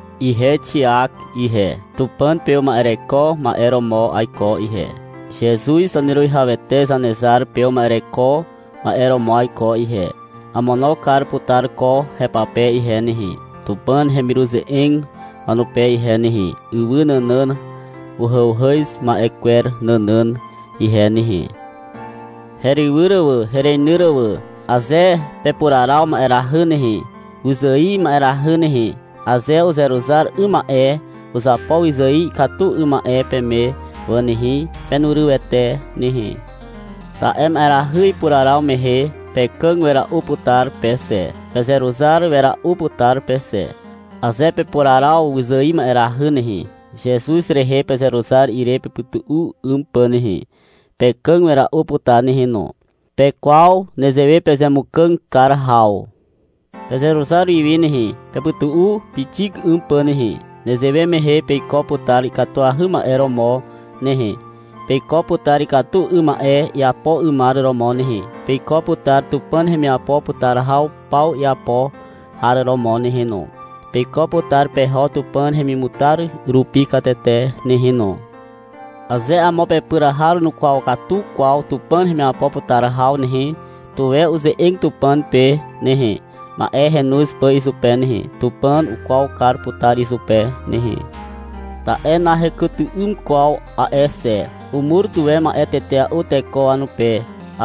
Ihe Xiak ihe, Tupàn pe uma'ereko ma'e romo aiko ihe. Zezuz Zaneruwihawete Zanezar pe uma'ereko ma'e romo aiko ihe. Amono kar putar ko hepape ihe nehe, Tupàn hemiruze'eg wanupe ihe nehe, ywy nànàn uhàuhàz ma'e kwer nànàn ihe nehe. Herywyr wà, hereinyr wà. Aze pepuraraw ma'erahy nehe, wyzài ma'erahy nehe, aze uzeruzar 'ym ma'e uzapo wyzài ikatu 'ym ma'e peme wà nehe, penurywete nehe. Ta'e ma'erahy ipuraraw mehe pekàg wera'u putar pe xe. Pezeruzar wera'u putar pe xe. Aze pepuraraw wyzài ma'erahy nehe, Zezuz rehe pezeruzar ire pepytu'u 'ym pà nehe, pekàg wera'u putar nehe no. Pekwaw nezewe pezemukàg kar haw. Pezeruzar wiwi nehe, pepytu'u pixik 'ym pà nehe. Nezewe mehe peiko putar ikatuahy ma'e romo nehe. Peiko putar ikatu 'ym ma'e iapo 'ymar romo nehe. Peiko putar Tupàn hemiapo putar haw paw iapo har romo nehe no. Peiko putar peho Tupàn hemimutar rupi katete nehe no. Aze amo pepyr har nukwaw katu kwaw Tupàn hemiapo putar haw nehe, tuwe uze'eg Tupàn pe nehe, ma'e henoz pà izupe nehe. Tupàn ukwaw kar putar izupe nehe. Ta'e nahekyty'ym kwaw a'e xe. Umur tuwe ma'e tetea'u teko wanupe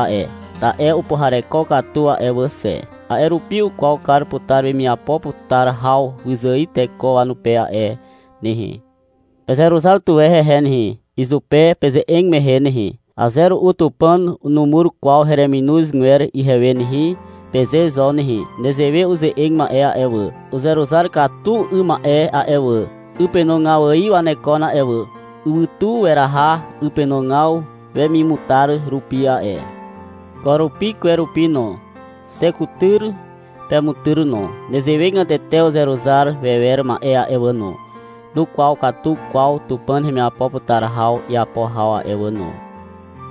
a'e, ta'e upuhareko katu a'e wà xe. A'e rupi ukwaw kar putar wemiapo putar haw wyzài teko wanupe a'e nehe. Pezeruzar tuwe hehe nehe, izupe peze'eg mehe nehe. — Aze ru'u Tupàn numur kwaw hereminozgwer ihewe nehe, peze zo nehe. Nezewe uze'eg ma'e a'e wà, uzeruzar katu 'ym ma'e a'e wà, 'ypenogaw ài wanekon a'e wà. Ywytu weraha 'ypenogaw wemimutar rupi a'e. Ko rupi, kwe rupi no. Xe kutyr, pemutyr no. Nezewegatete uzeruzar wewer ma'e a'e wà no, nukwaw katu kwaw Tupàn hemiapo putar haw iapo haw a'e wà no.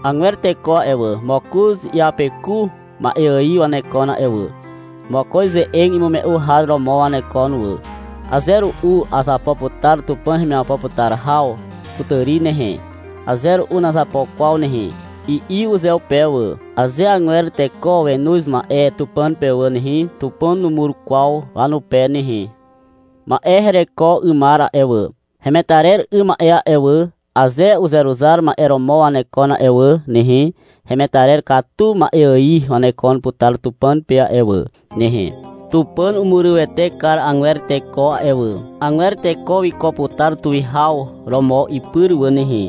Agwer teko a'e wà, mokoz iapeku ma'e ài wanekon a'e wà. Mokoz ze'eg imume'u har romo wanekon wà. — Aze ru'u azapo putar Tupàn hemiapo putar haw kutàri nehe, aze ru'u nazapo kwaw nehe, i'i uzeupe wà. Aze agwer teko wenoz ma'e Tupàn pe wà nehe, Tupàn numur kwaw wanupe nehe. Ma'e hereko 'ymar a'e wà, hemetarer 'ym ma'e a'e wà, aze uzeruzar ma'e romo wanekon a'e wà nehe, hemetarer katu ma'e ài wanekon putar Tupàn pe a'e wà nehe. Tupàn umurywete kar agwer teko a'e wà. Agwer teko wiko putar tuwihaw romo ipyr wà nehe.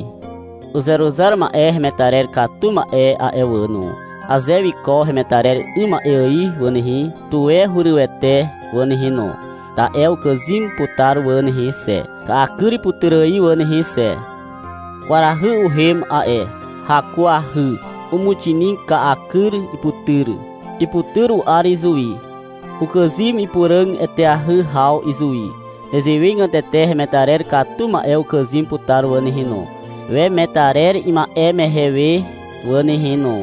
Uzeruzar ma'e hemetarer katu ma'e a'e wà no, aze wiko hemetarer 'ym ma'e ài wà nehe, tuwe hurywete wà nehe no. Ta'e ukàzym putar wà nehe xe, ka'a kyr iputyr ài wà nehe xe. Kwarahy uhem a'e. Hakuahy. Umuxinig ka'akyr iputyr. Iputyr u'ar izuwi. Ukàzym ipuràg eteahy haw izuwi. Nezewegatete hemetarer katu ma'e ukàzym putar wà nehe no, wemetarer ima'e mehe we wà nehe no.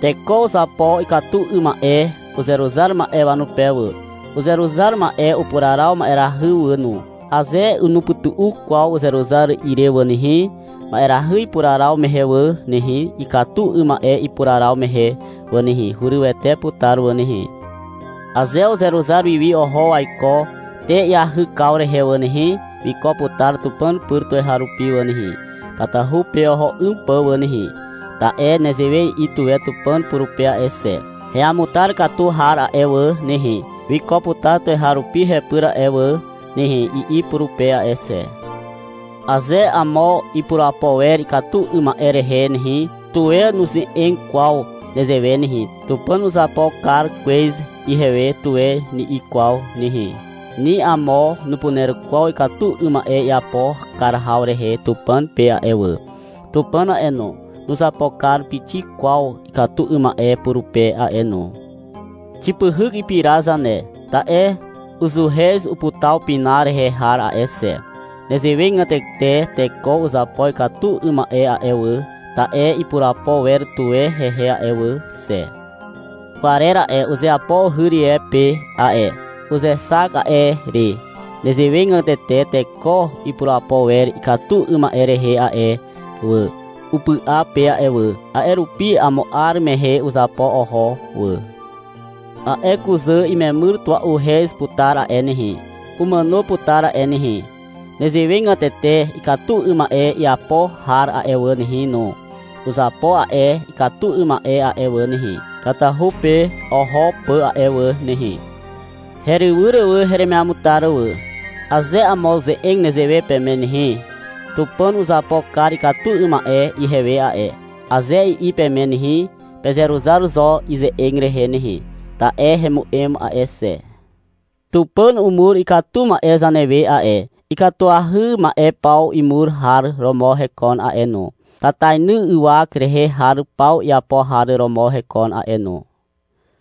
Teko uzapo ikatu 'ym ma'e uzeruzar ma'e wanupe wà. Uzeruzar ma'e upuraraw ma'erahy wà no. Aze nupytu'u kwaw uzeruzar ire wà nehe, ma'erahy ipuraraw mehe wà nehe, ikatu 'ym ma'e ipuraraw mehe wà nehe, hurywete putar wà nehe. Aze uzeruzar wiwi oho waiko te iahykaw rehe wà nehe, wiko putar Tupàn pyr tuweharupi wà nehe, tatahu pe oho 'ym pà wà nehe. Ta'e nezewe i'i tuwe Tupàn purupe a'e xe. — Heamutar katu har a'e wà nehe, wiko putar tuweharupi hepyr a'e wà nehe, i'i purupe a'e xe. Aze amo ipurapo wer ikatu 'ym ma'e rehe nehe, tuwe nuze'eg kwaw nezewe nehe, — Tupàn uzapo kar kwez ihewe, tuwe ni'i kwaw nehe. Ni amo nupuner kwaw ikatu 'ym ma'e iapo kar haw rehe Tupàn pe a'e wà. Tupàn a'e no, nuzapo kar pixik kwaw ikatu 'ym ma'e purupe a'e no. Xipyhyk ipira zane, ta'e uzuhez uputaw pina rehe har a'e xe. Nezewegatete teko uzapo ikatu 'ym ma'e a'e wà, ta'e ipurapo wer tuwe hehe a'e wà xe. Kwarer a'e, uzeapo uhy rie pe a'e. Uzexak a'e re. Nezewegatete teko ipurapo wer ikatu 'ym ma'e rehe a'e wà, upy'a pe a'e wà. A'e rupi amo 'ar mehe uzapo oho wà. A'e kuzà imemyr tua'uhez putar a'e nehe, umàno putar a'e nehe. Nezewegatete ikatu 'ym ma'e iapo har a'e wà nehe no, uzapo a'e ikatu 'ym ma'e a'e wà nehe, tatahu pe oho pà a'e wà nehe. Herywyr heremiamutar wà. Aze amo uze'eg nezewe peme nehe. — Tupàn uzapo kar ikatu 'ym ma'e ihewe a'e, aze i'i peme nehe, pezeruzar zo ize'eg rehe nehe. Ta'e hemu'em a'e xe. Tupàn umur ikatu ma'e zanewe a'e. Ikatuahy ma'e paw imur har romo hekon a'e no. Tatainy ywak rehe har paw iapo har romo hekon a'e no.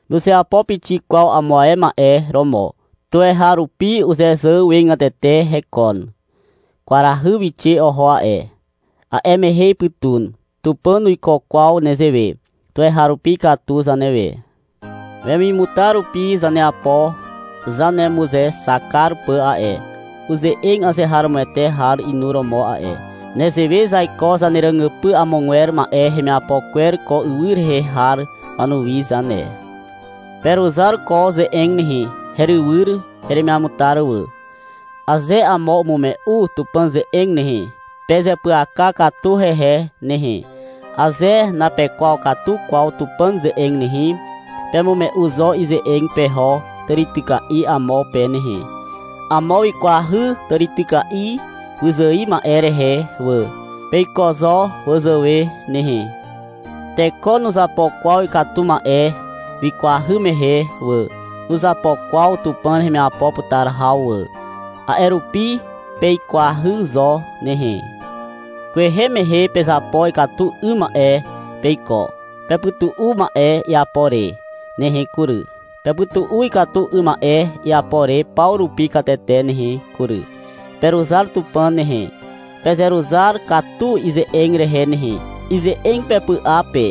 Nuzeapo pixik kwaw amo ae ma'e romo. Tuweharupi uzezàwegatete hekon. Kwarahy wixe oho a'e. A'e mehe ipytun. Tupàn nuiko kwaw nezewe. Tuweharupi ikatu zanewe. Wemimutar rupi zaneapo zanemuzexak kar pà a'e. Uze'eg azeharomoete har inuromo a'e. Nezewe zaiko zaneràgypy amogwer ma'e hemiapo kwer ko ywy rehe har wanuwi zane. Peruzar ko ze'eg nehe, herywyr heremiamutar wà. Aze amo umume'u Tupàn ze'eg nehe, pezeapyaka katu hehe nehe. Aze napekwaw katu kwaw Tupàn ze'eg nehe, pemume'u zo ize'eg peho tàrityka'i amo pe nehe. Amo wikwahy tàrityka'i wyzài ma'e rehe wà. Peiko zo wazàwe nehe. Teko nuzapo kwaw ikatu ma'e wikwahy mehe wà. Nuzapo kwaw Tupàn hemiapo putar haw wà. A'e rupi, peikwahy zo nehe. Kwehe mehe pezapo ikatu 'ym ma'e peiko. Pepytu'u a'e ma'e iapo re nehe kury. Pepytu'u ikatu 'ym ma'e iapo re paw rupi katete nehe kury. Peruzar Tupàn nehe. Pezeruzar katu ize'eg rehe nehe, ize'eg pepy'a pe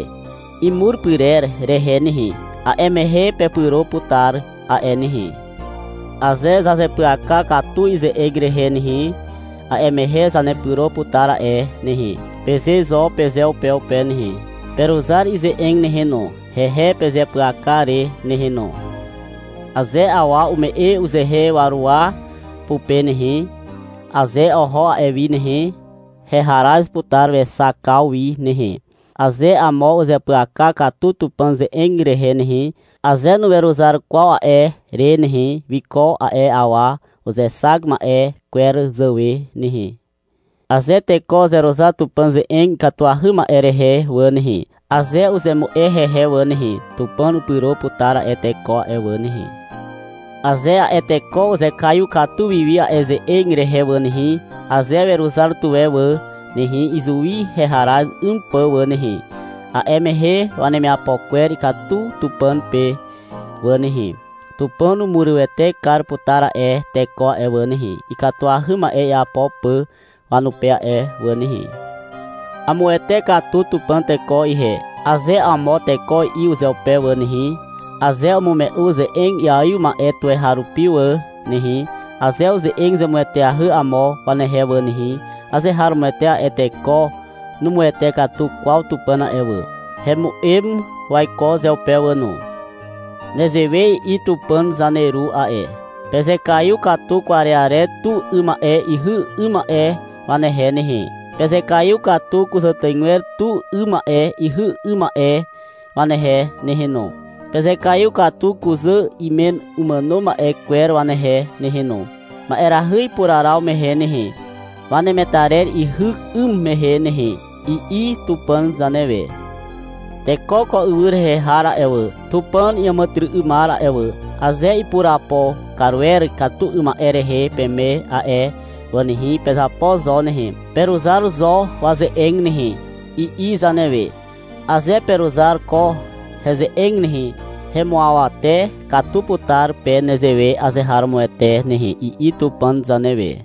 imur pyrer rehe nehe. A'e mehe pepyro putar a'e nehe. — Aze zazeapyaka katu ize'eg rehe nehe, a'e mehe zanepyro putar a'e nehe, peze zo pezeupeupe nehe. Peruzar ize'eg nehe no, hehe pezeapyaka re nehe no. Aze awa ume'e uzehe waruwa pupe nehe, aze oho a'e wi nehe, heharaz putar wexakaw wi nehe. Aze amo uzeapyaka katu Tupàn ze'eg rehe nehe, aze nuweruzar kwaw a'e re nehe, wiko a'e awa uzexak ma'e kwer zàwe nehe. Aze teko uzeruzar Tupàn ze'eg ikatuahy ma'e rehe wà nehe, aze uzemu'e hehe wà nehe, Tupàn upyro putar a'e teko a'e wà nehe. Aze a'e teko uzekaiw katu wiwi a'e ze'eg rehe wà nehe, aze weruzar tuwe wà nehe, izuwi heharaz 'ym pà wà nehe, a'e mehe wanemiapo kwer ikatu Tupàn pe wà nehe. Tupàn umurywete kar putar a'e teko a'e wà nehe, ikatuahy ma'e iapo pà wanupe a'e wà nehe. — Amuwete katu Tupàn teko ihe, aze amo teko i'i uzeupe wà nehe, aze umume'u ze'eg iaiw ma'e tuweharupi wà nehe, aze uze'eg zemueteahy amo wanehe wà nehe, azeharomoete a'e teko numuwete katu kwaw Tupàn a'e wà. Hemu'em waiko uzeupe wà no. Nezewe i'i Tupàn zaneru a'e. — Pezekaiw katu kwarearer tu 'ym ma'e ihy 'ym ma'e wanehe nehe. Pezekaiw katu kuzàtàigwer tu 'ym ma'e ihy 'ym ma'e wanehe nehe no. Pezekaiw katu kuzà imen umàno ma'e kwer wanehe nehe no, ma'erahy ipuraraw mehe nehe, wanemetarer ihyk 'ym mehe nehe, i'i Tupàn zanewe. — Teko ko ywy rehe har a'e wà, Tupàn iàmàtyry'ymar a'e wà, aze ipurapo kar wer ikatu 'ym ma'e rehe peme a'e wà nehe, pezapo zo nehe, peruzar zo waze'eg nehe, i'i zanewe. — Aze peruzar ko heze'eg nehe, hemuawate katu putar pe nezewe azeharomoete nehe, i'i Tupàn zanewe.